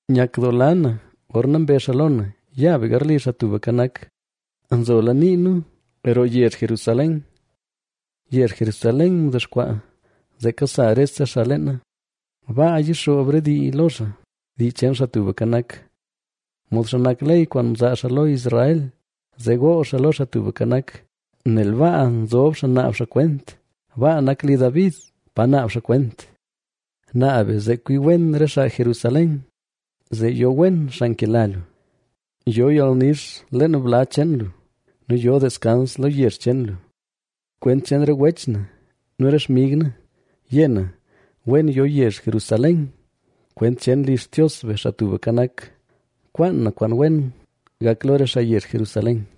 Nyakdoola na gorna mbezh xaa lo na: “Ya be garli Xaa Tubka Nak.” Nzola nii nu roo yezh Jerusalén. Yezh Jerusalén mdexkwaa, zee kasa rese xaa leena. Baa yixoob re dii lo xaa, dii cheen Xaa Tubka Nak. Modxa nak ley kwaan mzaa xaa lo Israel, zee gool xaa lo Xaa Tubka Nak. Nel baa nzob xaa naab xaa kwent, baa nak li David pa naab xaa kwent. Naab be zee kwii wen re xaa Jerusalén, zee yo wen xaa nkela lu. Yo yalnix leen bla cheen lu, nu yo deskans lo yezh cheen lu. Kwent cheen re wech na nu re xmig na, yé na: “Wen yo yezh Jerusalén.” Kwent cheen li Xtios be, Xaa Tubka Nak, kwaan na kwaan wen gak lo re xaa yezh Jerusalén.